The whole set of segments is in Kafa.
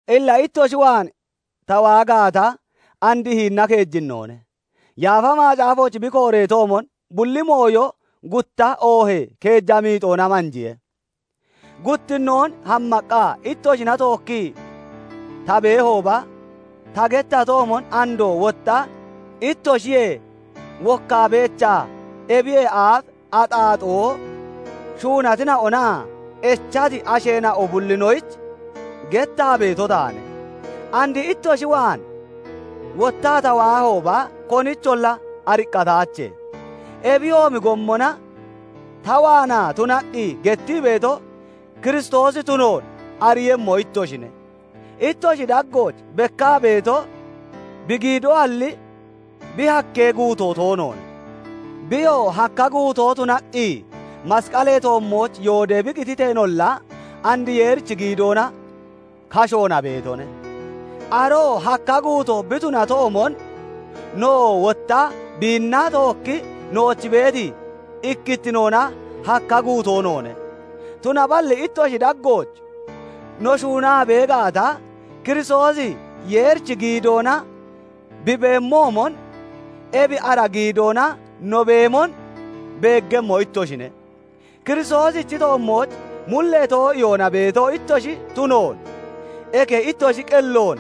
Illa ittoshi waan ta waa gaata, and hinina keejinnoone; Yaafa Macaafooch bi kooreetoomon, "Bulli mooyo gutta oohee keeja miixoona manjiye." Guttinnoon hammaqqa ittoshina tookkii ta beehooba ta gettatoomon, andoo wotta ittoshiyee wokkaa beechaa, ebiyee aaf axaaxoo shuunatina'onaa echati asheena'o bullinoyich gettaa beeto taane; and ittoshi waan wottaa ta waahooba, konicholla ariqqataache. Ebiyoomi gommona ta waanaa tunaqqi gettii beeto, Kiristoosi tunoon ariiyemmo ittoshine; ittoshi daggooch bekkaa beeto bi giidoalli, bi hakkee guutoo toonoone. Biyoo hakka guutoo tunaqqi masqalee toommooch yoodee bi qititeenolla, and Yeerichi giidoona kashoona beetone. Aroo hakka guutoo bi tunatoomon, nowoo wotta biinna tookkii nooch beeti ikkittinoona hakka guutoo noone; tunaballi ittoshi daggooch no shuunaa bee gaata, Kiristoosi Yeerichi giidoona bi beemoomon, ebi ara giidoona no beemon beeggemmo ittoshine. Kiristoosichi toommooch mullee too'iyoona beeto ittoshi tunoon, eke ittoshi qelloon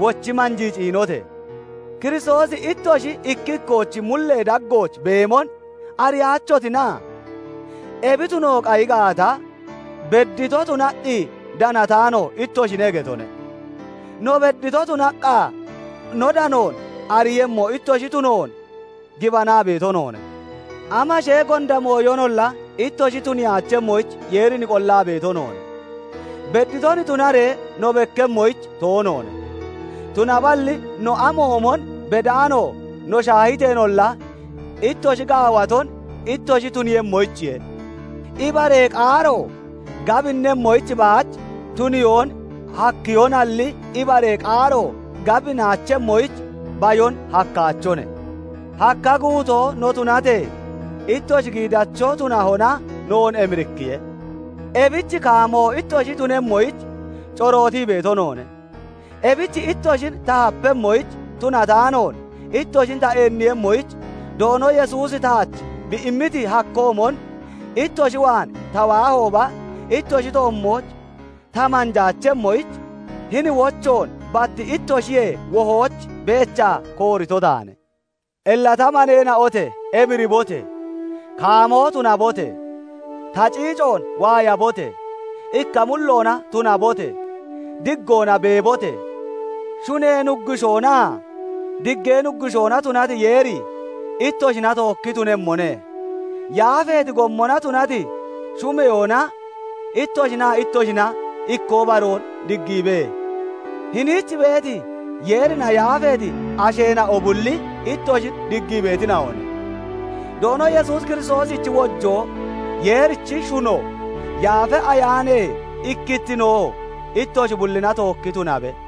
wochi manjii ciinote! Kiristoosi ittoshi ikki ikkoochi mullee daggooch beemon ariyaachotina? Ebi tuno qayi gaata, beddito tunaqqi danataano ittoshine getone; no beddito tunaqqa no danoon ariiyemmo ittoshi tunoon gibanaa beeto noone. Amashee gonda mooyonolla ittoshi tuniyaachemmoyich Yeerin qollaa beeto noone; bedditon tunaree no bekkemmoyich toonoone; tunaballi no amoomon bedaano no shaahiteenolla, ittoshi gaawaton ittoshi tuniiyemmoyichiye. Ibaree qaaro gabinnemmoyich baach tuniyoon hakkehonalli, ibaree qaaro gabinaachemmoyich bayon hakkaachone. Hakka guutoo no tunatee, ittoshi giidacho tunahona noon emirikkiye; ebich kaamoo ittoshi tunemmoyich corootii beeto noone. Ebich ittoshin ta hapemmoyich tunataanoon, ittoshin ta eenniiyemmoyich Doono Yesuusi taach bi immiti hakkoomon, ittoshi waan ta waahooba ittoshi toommooch ta manjaachemmoyich, hini wochoon bat ittoshiyee wohooch beechaa koorito taane. Illa ta maneena'ote! Emiribote! Kaamoo tunabote! Ta ciicoon waayabote! Ikka mulloona tunabote! Diggoona beebote! Shunee Nuggushoonaa Diggee Nuggushoona tunati Yeeri ittoshina tookki tunemmone. Yaafeeti gommona tunati shumeyoona ittoshinaa ittoshina ikkoo baroon diggiibe. Hiniich beeti, Yeerina yaafeeti asheena'o bulli ittoshin diggii beetina'one. Doono Yesuus Kiristoosichi wojoo, Yeerichi shuno, Yaafa Ayaanee ikkittinoo ittoshi bullina tookki tunabe.